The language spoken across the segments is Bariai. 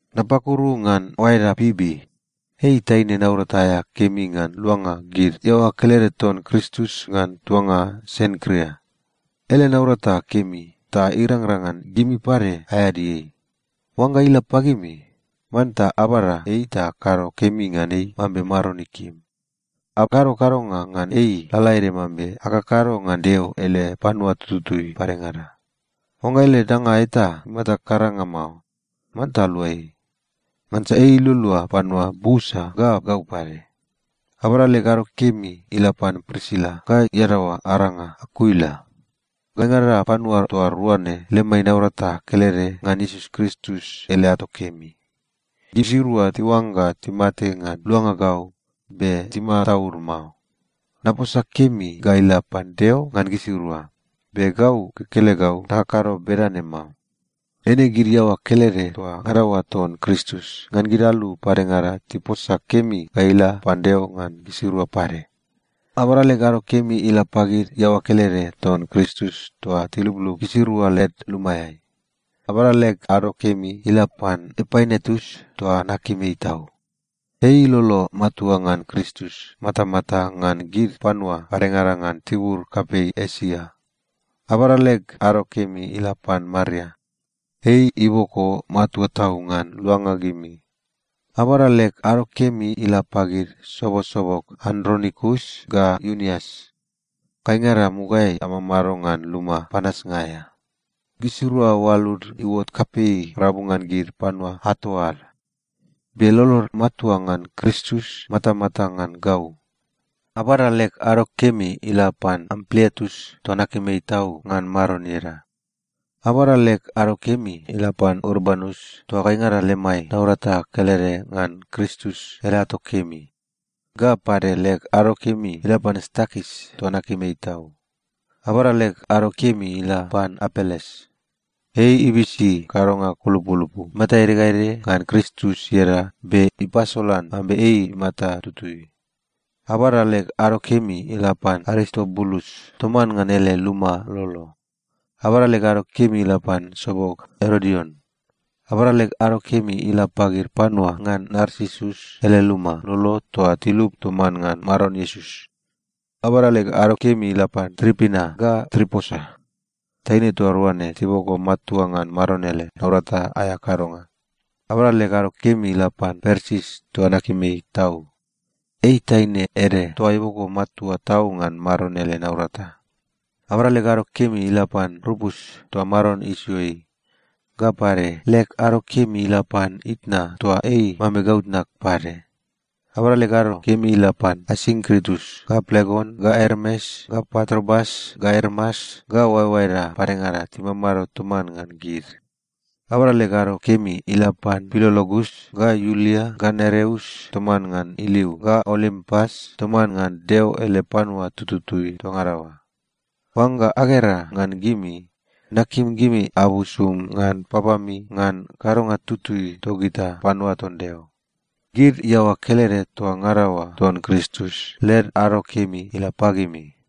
Napakuru ngan oaeda Pibi. Ei taine naurata aea kemi ngan luanga gid iaoa kelede ton Kristus ngan tuanga Senkria. Ele naurata kemi ta irangrang ngan gimi pade aeadi ei. Oangga ila pagimi, manta abada ei ta akado kemi ngan ei mambe Maron ikim. Akado kadonga ngan ei lalaede mambe akakado ngan Deo ele panua tututui padengada. Oangga ele danga eta imata karanga mao, manta alua ei. Ngansa ei ilualua panua busa ga gau pade. Abada leg ado kemi ila pan Prisila ga iadaoa aranga Akuila. Gaingada panua toa rua ne lemai naurata kelede ngan Iesus Kristus ele ato kemi. Gisirua tiuangga timate ngan luanga gau be timataud mao. Naposa kemi ga ila pan Deo ngan gisirua, be gau kekelegau nakakado bedane mao. Eine gid iaoa kelede toa ngada oa ton Kristus ngan gid alu padengada tiposa kemi ga ila pan Deo ngan gisirua pade. Abada leg ado kemi ila pagid iaoa kelede ton Kristus toa tiluplup gisirua led lumaeai. Abada leg ado kemi ila pan Epainetus toa nakim ei tau. Ei ilolo matua ngan Kristus matamata ngan gid panua padengada ngan tibur kapei Esia. Abada leg ado kemi ila pan Maria. Ei iboko matua tau ngan luanga gimi. Abada leg ado kemi ila pagid sobosobog Andronikus ga Iunias. Gaingada mugaeai amamado ngan luma panasnga aea. Gisirua oalud iuot kapei rabu ngan gid panua ato ad. Be lolod matua ngan Kristus matamata ngan gau. Abada leg ado kemi ila pan Ampliatus toa nakim ei tau ngan Maron ieda. Abada leg ado kemi ila pan Urbanus toa gaingada lemai naurata kelede ngan Kristus ele ato kemi. Ga pade, leg ado kemi ila pan Stakis toa nakim ei tau. Abada leg ado kemi ga ila pan Apeles. Ei ibisi kadonga kulupulupu imata ede ga ede ngan Kristus ieda be ipasolan mambe ei imata tutui. Abada leg ado kemi ila pan Aristobulus toman ngan ele luma lolo. Abada leg ado kemi ila pan sobog Erodion. Abada leg ado kemi ila pagid panua ngan Narsisus ele luma lolo toa tilup toman ngan Maron Iesus. Abada leg ado kemi ila pan Tripina ga Triposa. Taine toa rua ne tiboko matua ngan Maron ele naurata aea kadonga. Abada leg ado kemi ila pan Persis toa nakim ei tau. Ei taine ede toa iboko matua tau ngan Maron ele naurata. Abada leg ado kemi ila pan Rupus, toa Maron isio ei. Ga pade, leg ado kemi ila pan itna toa ei mambe gau tnag pade. Abada leg ado kemi ila pan Asinkritus, ga Plegon, ga Ermes, ga Patrobas, ga Ermas, ga oaeoaeda padengada timamado toman ngan gid. Abada leg ado kemi ila pan Pilologus, ga Iulia, ga Nereus toman ngan iliu, ga Olimpas toman ngan Deo ele panua tututui toa ngada oa. Oangga agera ngan gimi, nakim gimi abusum ngan papami ngan kadonga tutui togita panua ton Deo. Gid iaoa kelede toa ngada oa ton Kristus led ado kemi ila pagimi.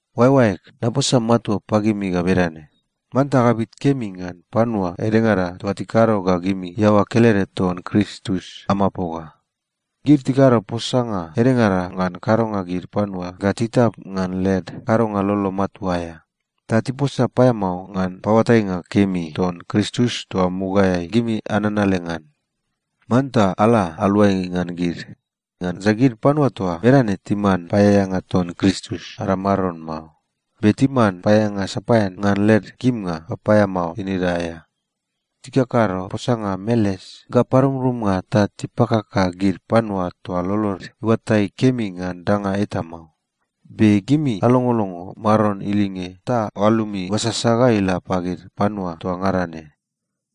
Oaeoaeg, naposa matua pagimi ga bedane: Manta agabit kemi ngan panua edengada toa tikado ga gimi iaoa kelede ton Kristus amapoga. Gid tikado posanga edengada ngan kadonga gid panua ga titap ngan led kadonga lolo matua aea, ta tiposa paeamao ngan paoatainga kemi ton Kristus toa mugaeai gimi ananale ngan. Manta ala aluai ngan gid. Ngansa gid panua toa bedane timan paeaeanga ton Kristus ada Maron mao, be timan paeaeanga sapaean ngan led kimnga papaeamao tinida aea. Tikakado posanga meles ga parumrumnga ta tipakaka gid panua toa lolod iuatai kemi ngan danga eta mao. Be gimi alongolongo Maron ilinge ta oalumi iuasasa ga ila pagid panua toa ngada ne.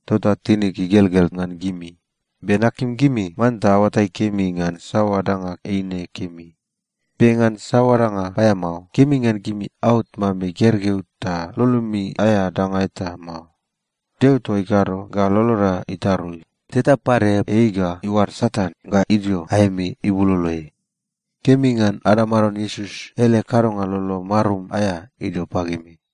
Tota tinig igelgel ngan gimi, be nakim gimi manta aoatai kemi ngan saoa danga eine kemi. Be ngan saoa danga paeamao, kemi ngan gimi aot mambe gergeu ta lolomi aea danga eta mao. Deo toa ikado ga loloda itarui, teta pade ei ga iuad Satan ga idio aemi ibuloloeai. Kemi ngan ada Maron Iesus ele kadonga lolo marum aea idio pagimi.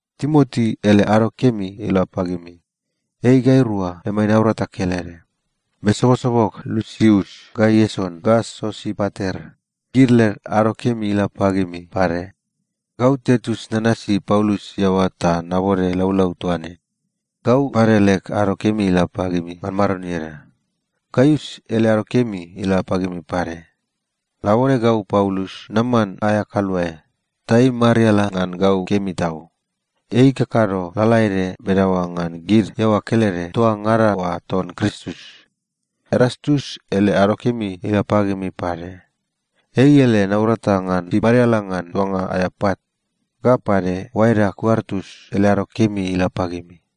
Timoti ele ado kemi ila pagimi. Ei gairua lemai naurata kelede. Be sobosobog Lusius ga Ieson ga Sosipater, gid led ado kemi ila pagimi pade. Gau Tertius nanasi Paulus iaoa ta nabode laulau toa ne. Gau pade leg ado kemi ila pagimi ngan Maron ieda. Gaius ele ado kemi ila pagimi pade. Labone gau Paulus naman aea kaluae, ta ei imariala ngan gau kemi tau. Ei ikakado lalaede bedaoa ngan gid iaoa kelede toa ngada oa ton Kristus. Erastus ele ado kemi ila pagimi pade. Ei ele naurata ngan imariala ngan tuanga aea pat. Ga pade, oaeda Kuartus ele ado kemi ila pagimi.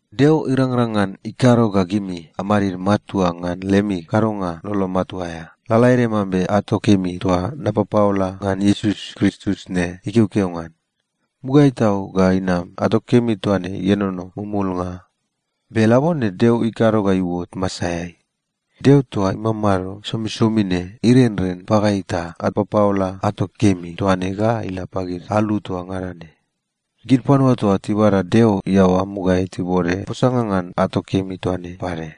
Deo irangrang ngan ikado ga gimi amadid matua ngan lemi kadonga lolo matua aea, lalaede mambe ato kemi toa napapaola ngan Iesus Kristus ne ikeokeo ngan. Mugaeai tau ga inam, ato kemi toa ne ienono mumulnga. Be labone Deo ikado ga iuot masaeai. Deo toa imamado somisomi ne irenren pagai ta apapaola ato kemi toa ne ga ila pagid alu toa ngada ne. Gid panua toa tibada Deo iaoa mugaeai tibode posanga ngan ato kemi toa ne pade.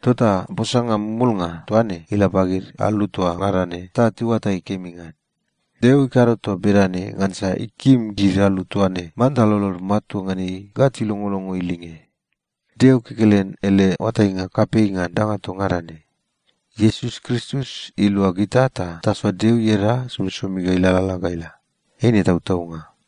Tota posanga mumulnga toa ne ila pagid alu toa ngada ne ta tiuatai kemi ngan. Deo ikado toa bedane ngansa ikim gid alu toa ne manta lolod matua ngan ei ga tilongolongo ilinge. Deo kekelen ele oatainga kapei ngan danga toa ngada ne. Iesus Kristus ilua gita ta tasoa Deo ieda somisomi ga ilalala ga ila. Eine tautaunga.